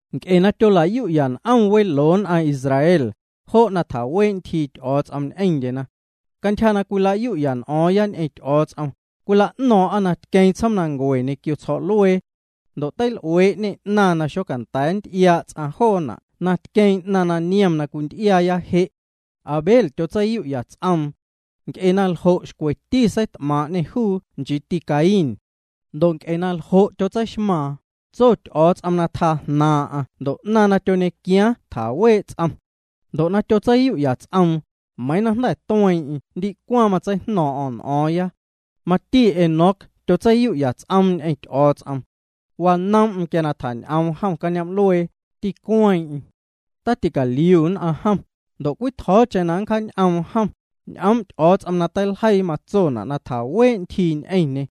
Nc'e na tyola'yu'ya n'om weloo nn'aⁿ Israel, jo' chii tjawee' ntyjii Ty'o̱o̱ts'om ñ'eⁿndyena. Cantyja na cwila'yu'ya n'o̱o̱ⁿ ñ'eⁿ Ty'o̱o̱ts'om, cwila'no̱o̱ⁿ'a na tqueeⁿ tsjoomnancue ñequio tsjo̱'luee. Ndo' teil'uee'ñê 'naⁿ na xocanda̱a̱ nty'iaa' ts'aⁿ joona' na tqueeⁿ 'naⁿ na niom na cwinty'iaaya je'. Abel tyotseiyu'ya ts'oom. Nc'e na ljo' xcweti seit'maaⁿ'ñê juu, nchiiti Caín. Ndo' nc'e na ljo' tyotseixmaaⁿ, tso Ty'o̱o̱ts'om na tjaa jnaaⁿ'aⁿ ndo' 'naⁿ na tyoñequiaaⁿ tjawee' ts'om. Ndo' na tyotseiyu'ya ts'oom, meiiⁿ na jnda̱ tueeⁿ'eⁿ ndicwaⁿ matseijno̱o̱ⁿ'o̱ⁿ n'o̱o̱ⁿya. Mati Enoc tyotseiyu'ya ts'oom ñ'eⁿ Ty'o̱o̱ts'om. Wanoom'm quia na tjañ'oom jom cañoom'luee, ticueeⁿeⁿ. Taticaliu nn'aⁿ jom, ndo' cwitjo̱o̱cheⁿ na nncjaañ'oom jom, ñ'oom' Ty'o̱o̱ts'om na teiljeii matsona' na tjaawee' ntyjii ñ'eⁿñê.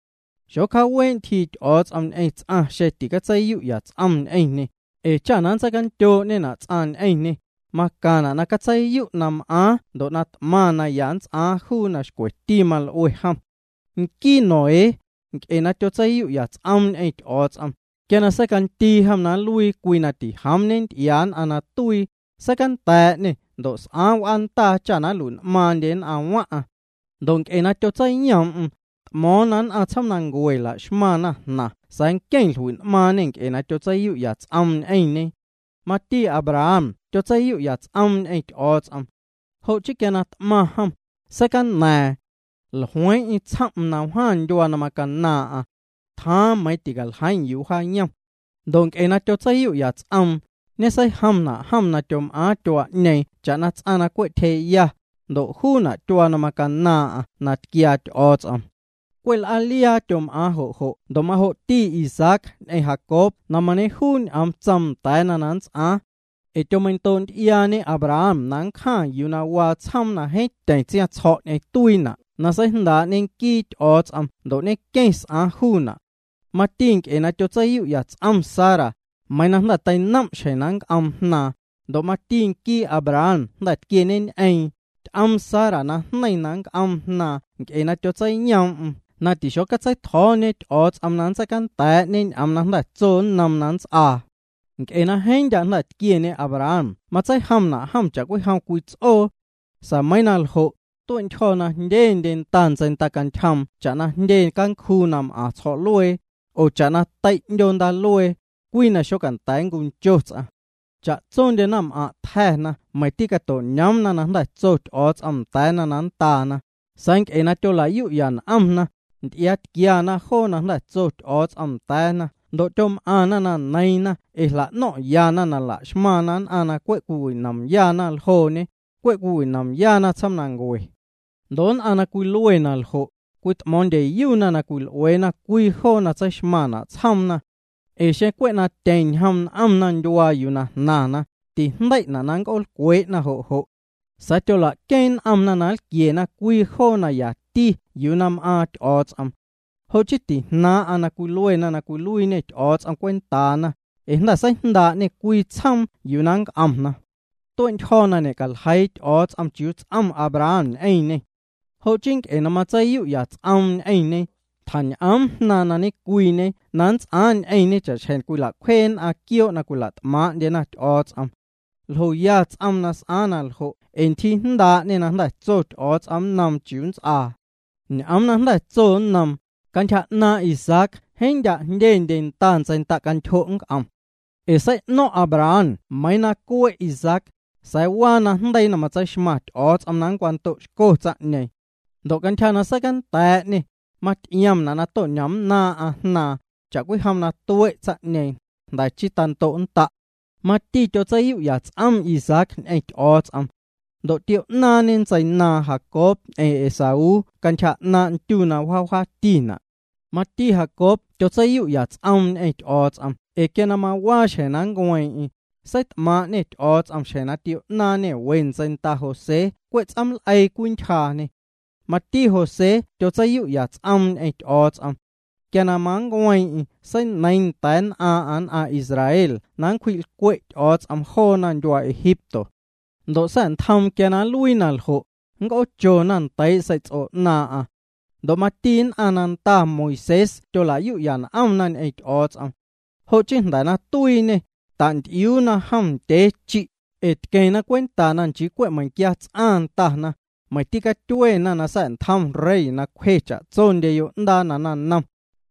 Xocjaawee' ntyjii Ty'o̱o̱ts'om ñ'eⁿ ts'aⁿ xeⁿ ticatseiyu'ya ts'om ñ'eⁿñê, ee cha na nntseicandyoo'ñena' ts'aⁿ ñ'eⁿñê, macaⁿna' na catseiyu' na m'aaⁿ ndo' na t'maⁿ naya nnts'aaⁿ juu na xcweti mal'ue jom. Nquii Noé, nc'e na tyotseiyu'ya ts'oom ñ'eⁿ Ty'o̱o̱ts'om, quia na seicandii jom na nluii cwii na tijoom ñenty'iaa nn'aⁿ na tuii, seicanda̱a̱'ñê ndo' s'aaⁿ w'aandaa cha nlui'n'maaⁿndye nn'aⁿ waⁿ'aⁿ. Ndo' nc'e na tyotseiyoom'm, t'mo̱o̱ⁿ na nn'aⁿ tsjoomnancue la'xmaⁿ jnaⁿ sa̱a̱ nqueⁿ jlui'n'maaⁿñê nc'e na tyotseiyu'ya ts'oom ñ'eⁿñe. Mati Abraham tyotseiyu'ya ts'oom ñ'eⁿ Ty'o̱o̱ts'om. Jo' chii quia na t'maⁿ jom, seicaña̱a̱ⁿ. Jlueeⁿ'eⁿ tsjom'm na wjaⁿ ndyuaa na macanaaⁿ'aⁿ. Tjaaⁿ meiⁿ ticaljeiiⁿ yuu wjaayom. Ndo' nc'e na tyotseiyu'ya ts'oom, ñeseijomna' jom na tyom'aaⁿ tyuaa'ñeeⁿ cha'na ts'aⁿ na cwe' tyjee'ya, ndo' juuna' tyuaa na macanaaⁿ'aⁿ na tquiaa Ty'o̱o̱ts'om. Cwe' l'aaliaa tyom'aaⁿ jo' jo' ndo' majo'ti Isaac ñ'eⁿ Jacob na mañejuu ñ'oom tsoom na nndaana na nnts'aaⁿ. Ee tyomeindoo'nty'iaañe Abraham na nncjaⁿ yuu waa tsjoom na jeeⁿ tyeⁿ tsiaⁿtsjo̱' ñ'eⁿ tuiina' na seijndaa'ñe nquii Ty'o̱o̱ts'om ndo' ñenqueⁿ s'aaⁿ juuna'. Mati nc'e na tyotseiyu'ya ts'om Sara, meiiⁿ na jnda̱ teinoom' xjeⁿ na nc'oom jnaaⁿ, ndo' mati nquii Abraham jnda̱ tquieñeñ'eeⁿ, ty'oom Sara najneiⁿ na nnc'oom jnaaⁿ nc'e na tyotseiyoom'm na tixotseitjo̱o̱ñe Ty'o̱o̱ts'om na nntseicanda̱a̱'ñe ñ'oom na tso nnoom na nnts'aa. Nc'e na jeeⁿ ndya' tquieñe Abraham matseijomna' jom cha'cwijom cwii ts'oo. Sa̱a̱ meiiⁿ na ljo', tue'ntyjo̱ na jndyendye nda ntseindacantyjoom cha'na jndyendye cancjuu na m'aⁿ tsjo̱'luee, oo cha'na tei' 'ndyoo ndaaluee, cwii na xocanda̱a̱ nncuncho ts'aⁿ. Cha'tsondye naⁿm'aⁿ' tja̱na meiⁿ tîcato'ñoomna na jnda̱ tso Ty'o̱o̱ts'om nda̱a̱na na nndaana, sa̱a̱ nc'e na tyola'yu'ya n'omna, nty'iaatquiana joona' na jnda̱ tso Ty'o̱o̱ts'om na nndaana ndo' tyom'aⁿna na neiiⁿna ee jla'no̱ⁿ'yana na la'xmaⁿna nn'aⁿ na cwe' m'aⁿyana ljooñe, cwe' cwiwinomyana tsjoomnancue. Ndo' nn'aⁿ na cwilue na ljo', cwit'mo̱o̱ⁿndyeyuna na cwil'ueena cwii joo na tseixmaⁿna' tsjoomna. Ee xeⁿ cwe' na tyeⁿ ñjom n'omna ndyuaa yuu na jnaⁿna, tijndei'na' na nnc'oolcwee'na jo' jo'. Sa̱a̱ tyola'queeⁿ n'omna na lquiena cwii joo na yati yuu na m'aaⁿ Ty'o̱o̱ts'om. Jo' chii tijnaaⁿ'aⁿ na cwiluena na cwiluiiñê Ty'o̱o̱ts'om cwentaana, ee jnda̱ seijndaa'ñê cwii tsjoom yuu na nnc'omna. Tue'ntyjo̱ na ñe'caljeii Ty'o̱o̱ts'om chiuu ts'om Abraham ñ'eⁿñê. Jo' chii nc'e na matseiyu'ya ts'oom ñ'eⁿñe, tjañ'oom jnaaⁿ na ñecwiiñe na nnts'aaⁿ ñ'eⁿñe cha'xjeⁿ cwila'cwjee nn'aⁿ quioo' na cwila't'maaⁿ'ndyena Ty'o̱o̱ts'om. Ljoya ts'oom na s'aaⁿ naljo' ee ntyjii jndaa'ñê na jnda̱ tso Ty'o̱o̱ts'om nnoom chiuu nnts'aa. Ñ'oom na jnda̱ tso nnoom: “Cantyja 'naaⁿ' Isaac jeeⁿ ndya' jndyendye nda ntseindacantyjo' nnc'om.” Ee sei'no̱ⁿ' Abraham meiiⁿ na cue' Isaac, sa̱a̱ waa najndeii na matseixmaⁿ Ty'o̱o̱ts'om na nncwando'xco juu. Ndo' cantyja na seicanda̱a̱'ñê, maty'iomna' na to'ñomnnaaⁿ'aⁿ jnaaⁿ, cha'cwijom na tue' tsaⁿ'ñeeⁿ, jnda̱ chii tando'nnda'. Mati tyotseiyu'ya ts'om Isaac ñ'eⁿ Ty'o̱o̱ts'om. Ndo' tio'naaⁿñe ntseinaaⁿ Jacob ñ'eⁿ Esaú cantyja 'naaⁿ' ndyu na wjaa wjaatina'. Mati Jacob tyotseiyu'ya ts'oom ñ'eⁿ Ty'o̱o̱ts'om ee quia na mawaa xjeⁿ na nncueeⁿ'eⁿ, seit'maaⁿ'ñê Ty'o̱o̱ts'om xjeⁿ na tio'naaⁿñê we ntseinda José cwe' ts'ooml'eii cwintyjee'ñê. Mati José tyotseiyu'ya cwii ts'oom ñ'eⁿ Ty'o̱o̱ts'om. Quia na mancueeⁿ'eⁿ seineiiⁿ nda̱a̱ nn'aaⁿ'aⁿ nn'aⁿ Israel na nncwji'lcwe' Ty'o̱o̱ts'om joona ndyuaa Egipto. Ndo' sa̱'ntjoom quia na nluii na ljo', c'oochona ndei' sei'ts'o 'naaⁿ'aⁿ. Ndo' mati nn'aⁿ na ndana Moisés tyola'yu'ya n'omna ñ'eⁿ Ty'o̱o̱ts'om. Jo' chii jnda̱ na tuiiñê, tanty'iuuna jom ndyee chi', ee tqueⁿna cwenta nchii cwe' meiⁿquia ts'aⁿ ndana, meiⁿ tîcatyuena na sa̱'ntjom rey na cwje cha'tsondye yo'ndaa na naⁿnom.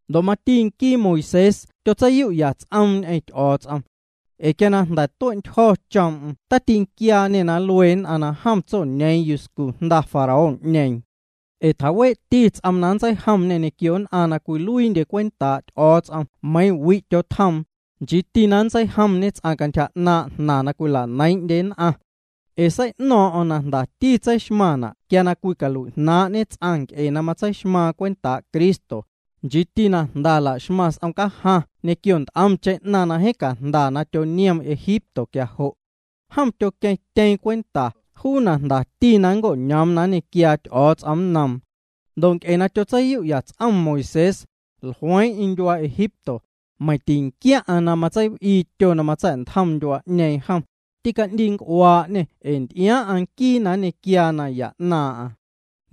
Ndo' mati nquii Moisés tyotseiyu'ya ts'oom ñ'eⁿ Ty'o̱o̱ts'om. Ee quia na jnda̱ tue'ntyjo̱ choom'm tatinquiaañê na nlue nn'aⁿ na jom tsoñeeⁿ yuscu jnda Faraón'ñeeⁿ. Ee tjawee'ti ts'oom na matseijomñê ñequio nn'aⁿ na cwiluiindye cwentaa' Ty'o̱o̱ts'om meiiⁿ wi' tyotjoomna, nchiiti na nntseijomñê cantyja 'naaⁿ' jnaⁿ na cwila'neiiⁿ'ndye nn'aⁿ. Ee sei'no̱o̱ⁿ'o̱ⁿ na jndati tseixmaⁿna' quia cwicalui'jnaaⁿ'ñe ts'aⁿ nc'e na matseixmaⁿ cwentaa' Cristo, nchiiti na jnda la'xmaⁿ s'om cajaⁿ ñequio nt'omcheⁿ na jeeⁿ cajnda na tyoniom Egipto quia jo'. Jom tyoqueⁿtyeeⁿ cwenta juu na jndati na nnco'ñoom na nñequiaa Ty'o̱o̱ts'om nnoom. Ndo' nc'e na tyotseiyu'ya ts'om Moisés, jlueeⁿ'eⁿ ndyuaa Egipto, meiⁿ tinquiaⁿ'aⁿ na matseiw'ii tyo na matsa̱'ntjom ndyuaa'ñeeⁿ jom, tî'ndiinc'uaa'ñê ee nty'iaaⁿ'aⁿ nquii na nñequiaa naya na nnaaⁿ'aⁿ.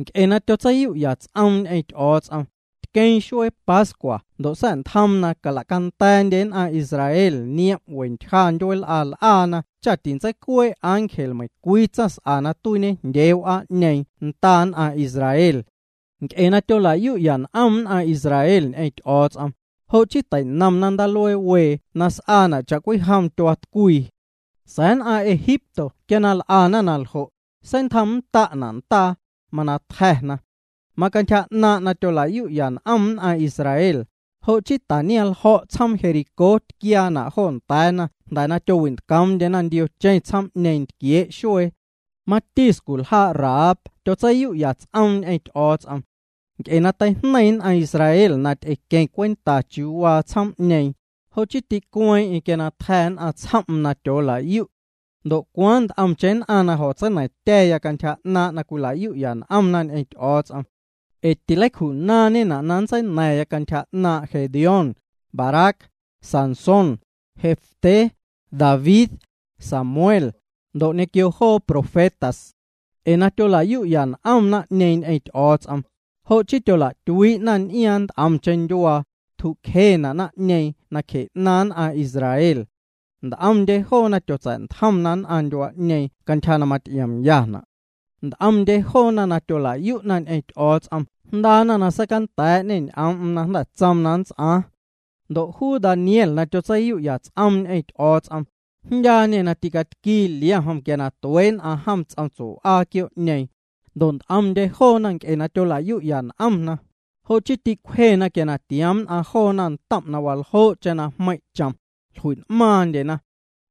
Nc'e na tyotseiyu'ya ts'oom ñ'eⁿ Ty'o̱o̱ts'om, tqueeⁿ xuee Pascua ndo' sa̱ntjoom na cala'canda̱a̱ndye nn'aⁿ Israel niom' we ntyja ndyueel'a l'aana cha tintseicuee' ángel meiⁿcwii tsaⁿs'a na tuiiñejndyee w'aa'ñeeⁿ nda nn'aⁿ Israel. Nc'e na tyola'yu'ya n'om nn'aⁿ Israel ñ'eⁿ Ty'o̱o̱ts'om, jo' chii teinomna Ndaaluee Wee na s'aana' cha'cwijom tyuaatcwii. Sa̱a̱ nn'aⁿ Egipto quia na l'ana na ljo', seitjomnnda'na' ndaa, mana tja̱na. Macantyja 'naaⁿ' na tyola'yu'ya n'om nn'aⁿ Israel, jo' chii taniaⁿljo̱' tsjoom Jericó tquiaana' jo nda̱a̱na jnda̱ na tyowintcoomndyena ndiocheⁿ tsjoom'ñeeⁿ ntquiee' xuee. Mati sculjaa' Rahab tyotseiyu'ya ts'oom ñ'eⁿ Ty'o̱o̱ts'om. Nc'e na teijneiⁿ nn'aⁿ Israel na ty'equeⁿ cwenta chiuu waa tsjoom'ñeeⁿ, jo' chii ticueeⁿ'eⁿ quia tja̱ nn'aⁿ tsjoom'm na tyoola'yu'. Ndo' cwaaⁿ nt'omcheⁿ nn'aⁿ na jo̱tseina̱ⁿtya̱ cantyja 'naaⁿ' na cwila'yu'ya n'om ñ'eⁿ Ty'o̱o̱ts'om. Ee tileicju'naaⁿñena' na nntseina̱ⁿya cantyja 'naaⁿ' Gedeón, Barac, Sansón, Jefté, David, Samuel, ndo' ñequio joo profetas. Ee na tyola'yu'ya n'om naⁿ'ñeeⁿ ñ'eⁿ Ty'o̱o̱ts'om, jo' chii tyola'tyuii'na n'iaaⁿ nt'omcheⁿ ndyuaa, tju'cjena' naⁿ'ñeeⁿ nacje 'naaⁿ nn'aⁿ Israel. Nt'omndye joona tyotsa̱'ntjomna nn'aⁿ ndyuaa'ñeeⁿ cantyja na maty'iomyana'. Nt'omndye joona na tyola'yu'na ñ'eⁿ Ty'o̱o̱ts'om jndaana na seicanda̱a̱'ñê ñ'oom'm na jnda̱ tsoom na nnts'aaⁿ. Ndo' juu Daniel na tyotseiyu'ya ts'om ñ'eⁿ Ty'o̱o̱ts'om, jndyaañê na tîcatquii liom jom quia tuee' nn'aⁿ jom ts'om tsue'w'aa quioo'ñeeⁿ, ndo' nt'omndye joona nc'e na tyola'yu'ya n'omna, jo' chii tîcwjena quia tioom nn'aⁿ joona ntom' na waljoo'cheⁿ na jmeiⁿ' chom, jlui'n'maaⁿndyena.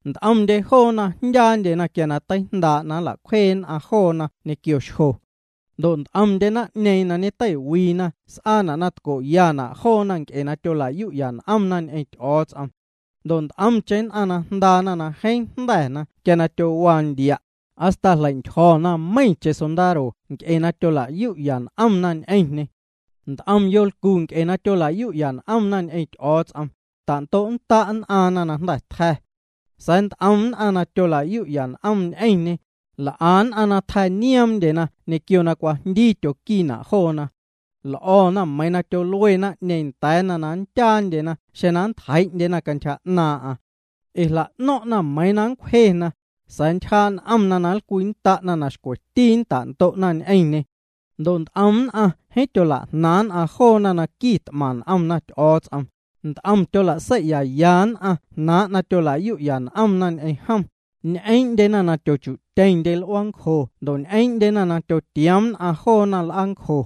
Nt'omndye joona jndyaandyena quia teijndaa' na nla'cwjee nn'aⁿ joona ñequio xjo. Ndo' nt'omndye naⁿ'ñeeⁿ na ñeteiwiina s'aana' na tco'yana' joona nc'e na tyola'yu'ya n'omna ñ'eⁿ Ty'o̱o̱ts'om. Ndo' nt'omcheⁿ nn'aⁿ jndaana na jeeⁿ jnda̱na quia tyowaa ndia', hasta jleintyjo̱na meiⁿcheⁿ sondaro nc'e na tyola'yu'ya n'omna ñ'eⁿñê. Nt'om yolcu nc'e na tyola'yu'ya n'omna ñ'eⁿ Ty'o̱o̱ts'om, tando'nnda' nn'aaⁿna na jnda̱ tja̱. Sa̱a̱ nt'om nn'aⁿ na tyola'yu'ya n'omna ñ'eⁿñê, l'a nn'aⁿ na tja̱nioomndyena ñequio na cwajndii tyoquiina' joona. L'o̱na meiiⁿ tyolue naⁿ'ñeeⁿ nda̱a̱na na nndyaandyena xeⁿ nntjeii'ndyena cantyja 'naaⁿ'aⁿ. Ee jla'no̱ⁿ'na meiiⁿ na nncwjena, sa̱a̱ ntyjaa' n'omna na nlcwinnda'na na xcweti na nnta'ndo'na ñ'eⁿñê. Ndo' nt'om nn'aⁿ jeeⁿ tyolajnaaⁿ' nn'aⁿ joona na quit'maⁿ n'omna Ty'o̱o̱ts'om, nt'om tyola'sei'yaya nn'aⁿ jnaaⁿ' na tyolayu'ya n'omna ñ'eⁿ jom, ñ'eeⁿndyena na tyochu'tyeⁿndye l'uaancjo ndo' ñ'eeⁿndyena na tyotioom nn'aⁿ joona l'aancjo.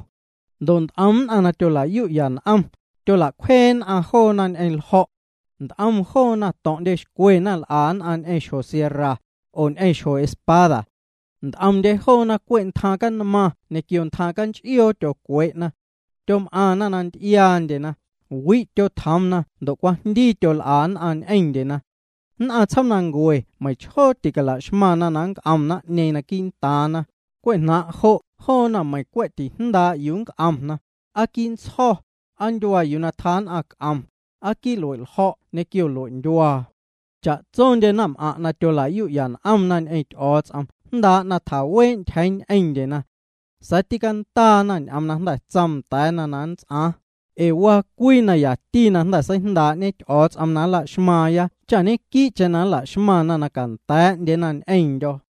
Ndo' nt'om nn'aⁿ na tyola'yu'ya n'omna, tyola'cwjee nn'aⁿ joona ñ'eⁿ ljo̱'. Nt'om joona to̱ⁿ'ndyexcwena l'a nn'aⁿ ñ'eⁿ xjo sierra, oo ñ'eⁿ xjo espada. Nt'omndye joona cwe' ntjaⁿ canmaⁿ ñequio ntjaⁿ canch'ioo tyocwee'na. Tyom'aⁿna na nty'iaandyeñ'eⁿna, wi' tyotjoomna ndo' cwajndii tyol'a nn'aⁿ ñ'eⁿndyena. Nn'aⁿ tsjoomnancue meiⁿchjoo ticala'xmaⁿna na nnc'om naⁿ'ñeeⁿ quii'ntaaⁿna, cwe' jnaaⁿ' jo' joona meiⁿ cwe' tijndaa' yuu nnc'omna, aa quii' ntsjo̱, aa ndyuaa yuu tjaa nn'aⁿ c'om, aa quii' lue'ljo̱' ñequio lue'ndyuaa. Cha'tsondye naⁿm'aⁿ' na tyola'yu'ya n'omna ñ'eⁿ Ty'o̱o̱ts'om jndaa' na tjawee' ntyjeeⁿ ñ'eⁿndyena. Sa̱a̱ tîcandaana ñ'oom na jnda̱ tsoom nda̱a̱na na nnts'aaⁿ, ee waa cwii na yati na jnda̱ seijndaa'ñe Ty'o̱o̱ts'om na nla'xmaaⁿya cha ñequii'cheⁿ nla'xmaⁿna na canda̱a̱'ndyena ñ'eⁿndyo̱.